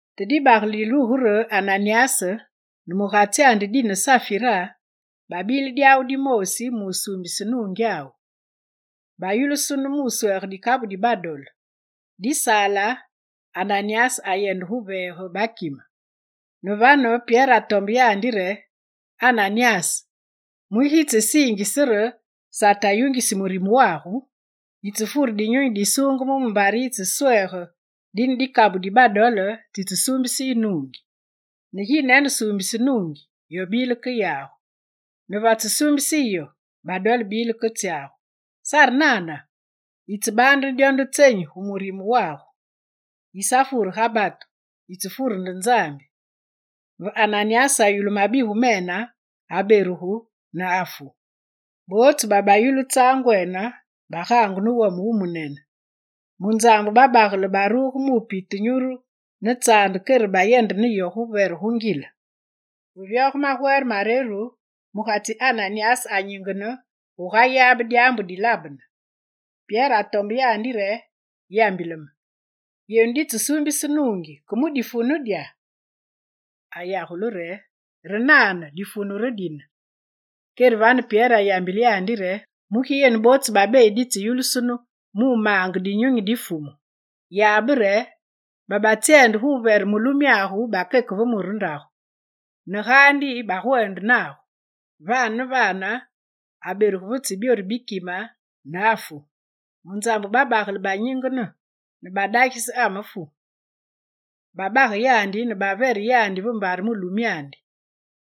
Te dibagele dilugu re Ananyas ne mugatsyandi dine Safira, babile dyawu dimoosi musuumbise nuungyawu. Bayulusunu mu wuswege dikabu di badole, disaale, Ananyas ayeveege bakime. Ne vane, Pyere atombe yandi re: «Ananyas, mugi yitsesiinge re Sate ayungisi murime wagu? Yitsefure Dinyunyi Disuungeme mumbare yitseswege dine dikabu di badole tsitsesuumbise yu nuungi. Ne ginene suumbise nuungi, yo bile ke yagu, ne vetse suumbise yu yo, badole bile ke tsyagu, sare nana? Yitsebaande ne dyo nde tsenyi gu murime wagu? Yisafure ga batu, yitsefure nde Nzambi.» Ve Ananyas ayulu mabigu mene, aberugu ne afu. Bootsu babayulu tsaangwene bagaangu ne wome wumunene. Munzambu babagele baruge mupite nyuru ne tsaande kere bayende ne yo guvere gu ngile. Ve vyoge magwere mareru, mugatsi Ananyas anyingene gugayabe dyaambu dilabene. Pyere atombe yandi re: «Yambile me, yenu ditsesuumbise nuungyenu ke mu difunu dya?» Ayagule re: «Re nane, difunu re dine.» Kere vane Pyere ayambile yandi re: «Mugi yenu bootsu babeyi ditseyulusunu mu maange Dinyunyi di Fumu? Yabe re, babetsyende guvere mulumyagu bakeke ve mure ndagu ne gaandi bagwende nagu.» Vane ne vane, aberugu ve tsi byoru bi kime ne afu. Munzambu babagele banyingene ne badagise amefu; babage yandi ne bavere yandi va mbare mulumyandi.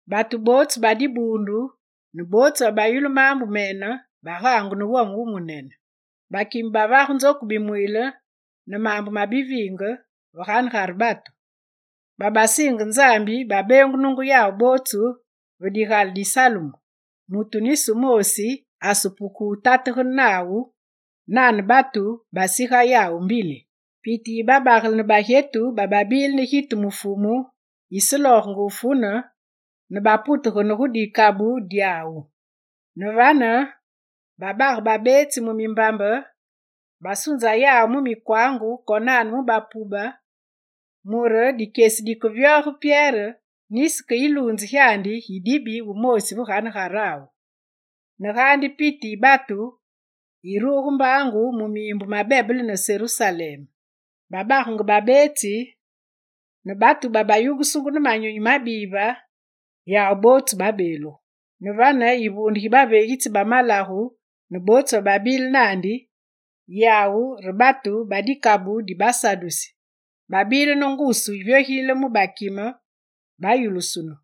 Batu bootsu ba dibuundu ne bootsu babayulu maambu mene bagaangu ne wome wumunene. Bakime bavage nzoku bimwiile ne maambu ma biviinge ve ganegare batu. Babasiinge Nzambi babeengunungu yawu bootsu va digale di Salumu. Mutu nisi wumoosi asepuke wuputegane nawu, nane batu basiga yawu mbili. Piti yi babagele ne bagyetu bababile ne gitu mu Fumu yiseloogenge wufune, ne baputegene gu dikabu dyawu. Ne vane babage babeetsi mu mimbamba, basunza yawu mu mikwangu konane mu bapube mure dikyesi dikevyoge Pyere, nisi ke yiluunze gyandi gidibi wumoosi ve ganegarawu. Ne gaandi piti yi batu yiruge mbaangu mu miimbu ma bebele ne Serusalem. Babagenge babeetsi, ne batu babayungusungu ne manyunyi mabive, yawu bootsu babeelugu. Ne vane, yivuunde gi baveegitsi ba malagu ne bootsu bababile naandi, yawu re batu ba dikabu di basadusi, babile ne ngusu yivyogilile mu bakime; bayulusunu.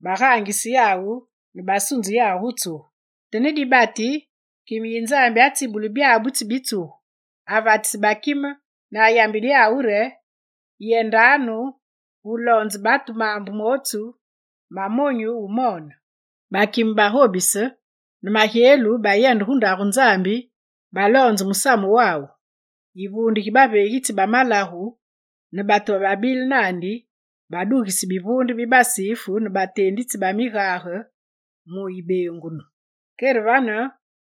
Bagaangise yawu ne basunze yawu gu tsugu. Te ne dibati, kime yi Nzambi atsibule byabutsu bi tsugu, avatise bakime ne ayambile yawu re: «Yendanu ne loonzanu batu maambu mootsu ma monyu wumoone.» Bakime bagobise; ne magyelu bayende gu Ndagu Nzambi, baloonze musamu wawu. Yivuunde gi baveegitsi ba malagu ne batu bababile naandi badugise bivuunde bi basifu ne bateenditsi ba migage mu yibeengunu. Kere vane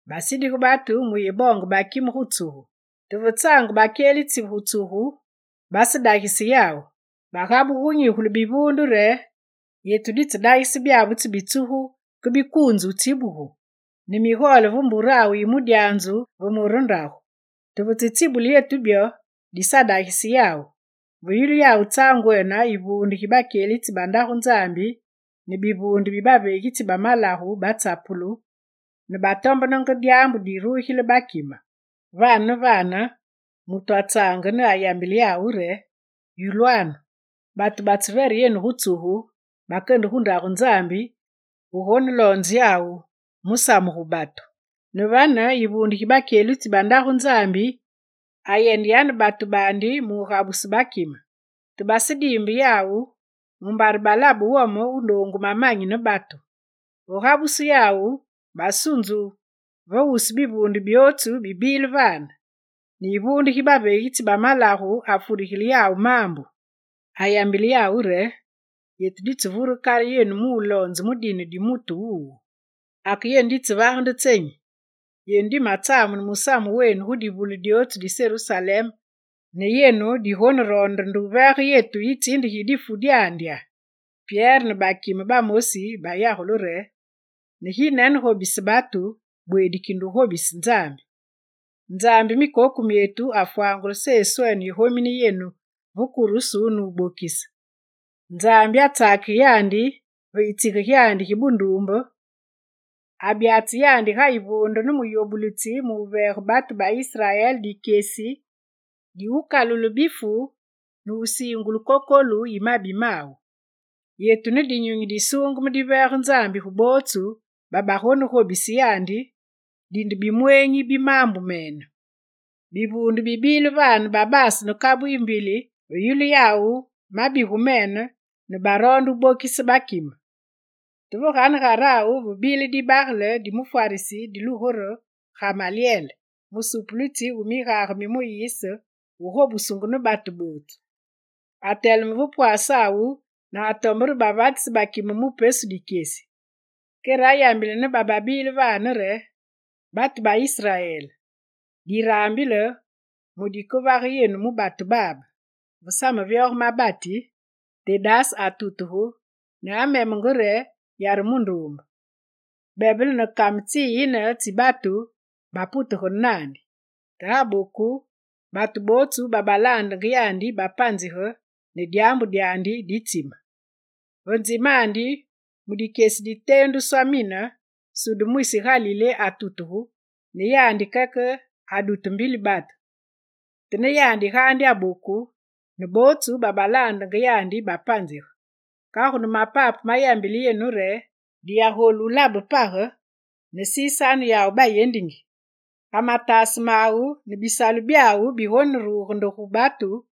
basindige batu muyeboonge bakime gu tsugu. Te ve tsaange bakyelitsi gu tsugu, basedagise yawu. Bagabugu gunyigule bivuunde re: «Yetu ditsedagise byabutsu bi tsugu ke bikuunzu wutsibugu, ne migole ve mburawu yi mudyanzu ve mure ndagu. Te vetsetsibule yetu byo, disadagise yawu.» Ve yulu yawu tsaangwene, yivuunde gi bakyelitsi ba Ndagu Nzambi ne bivuunde bi baveegitsi ba malagu batsapulu, ne batombenenge dyaambu dirugile bakime. Vane ne vane mutu atsaange ne ayambile yawu re: «Yulwanu! Batu batsevere yenu gu tsugu bakende gu Ndagu Nzambi gu goneloonze yawu musamu gu batu.» Ne vane, yivuunde gi bakyelitsi ba Ndagu Nzambi ayende yane batu baandi mugabuse bakime. Te basediimbe yawu mumbare balabe wome wu noongu mamanyi ne batu. Ve gabusu yawu, basunzu va wusu bivuunde byootsu bibile vane, ne yivuunde gi baveegitsi ba malagu afurigile yawu maambu. Ayambile yawu re: «Yetu divure kale yenu muloonze mu dine di mutu wuwu. Ake yenu ditsevage nde tsenyi? Yenu dimetsamune musamu wenu gu divule dyootsu di Serusalem ne yenu digoneroonde nde wuveege yetu yitsinde gi difu dyandi!» Pyere ne bakime bamosi bayagule re: «Ne ginene gobise batu, bweedi kinde wugobise Nzambi. Nzambi mikoku myetu afwangule Seswene yigomine yenu ve kurusu nubokise. Nzambi atsakige yandi ve yitsige gyandi gi bunduumbe, abyatse yandi ga yivuunde ne muyobulitsi muveege batu ba Israel dikyesi diwukalule bifu ne wusiingulu kokolu yi mabi mawu. Yetu ne Dinyunyi Disuungeme diveege Nzambi gu bootsu babagonegobise yandi, dinde bimweenyi bi maambu mene.» Bivuunde bibile vane bibaase ne kabu yimbili ve yulu yawu mabigu mene ne baroonde wubokise bakime. Te ve ganegarawu ve bile dibagele di mufwarisi dilugu re Gamalyel, musupulitsi wu migage mi Muyise wugobusungu ne batu bootsu. Ateleme ve pwasawu ne atombe re bavatisi bakime mu pesu dikyesi. Kere ayambile ne bababile vane re: «Batu ba Israel, diraambile mu dikevage yenu mu batu babe. Ve samevyoge mabati Tedas atutuge ne amemenge re yare munduumbe; bebele ne kame tsiyine tsi batu baputegane naandi. Te aboku, batu bootsu babalaandenge yandi bapanzige ne dyaambu dyandi ditsime. Va nzimandi, mu dikyesi diteenduswa mine, Suda mwisi Galilé atutugu; ne yandi keke adute mbili batu. Te ne yandi gaandi aboku, ne bootsu babalaandenge yandi bapanzige. Kagu ne mapape mayambile yenu re: diyagolu wulabe page ne sisanu yawu bayendingi. Ga mataase mawu ne bisalu byawu bigoneruge nde gu batu,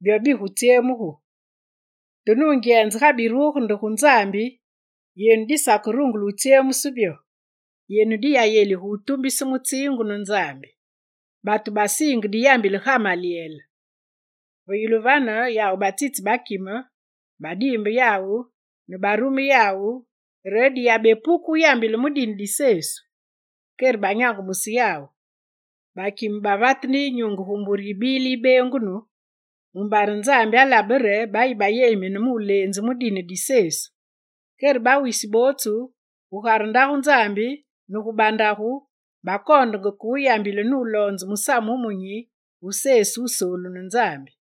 byo bigutsyemugu. Te nungyenze ga biruge nde gu Nzambi, yenu disakerungule wutsyemuse byo. Yenu diyayelige wutumbise mutsiingu ne Nzambi.» Batu basiinge diyambile Gamalyel. Ve yulu vane yawu batsitse bakime, badiimbe yawu, ne barume yawu re diyabepuke wuyambile mu dine di Sesu. Kere banyangumuse yawu. Bakime bavate ne yinyunge gu mbure yibile yibeengunu mumbare Nzambi alabe re bayi bayelimine mu leenzu mu dine di Sesu. Kere bawisi bootsu, gugare Ndagu Nzambi ne gu bandagu, bakoondenge ke wuyambile nuloonze Musamu Wumunyi wu Sesu, Wusoolu ne Nzambi.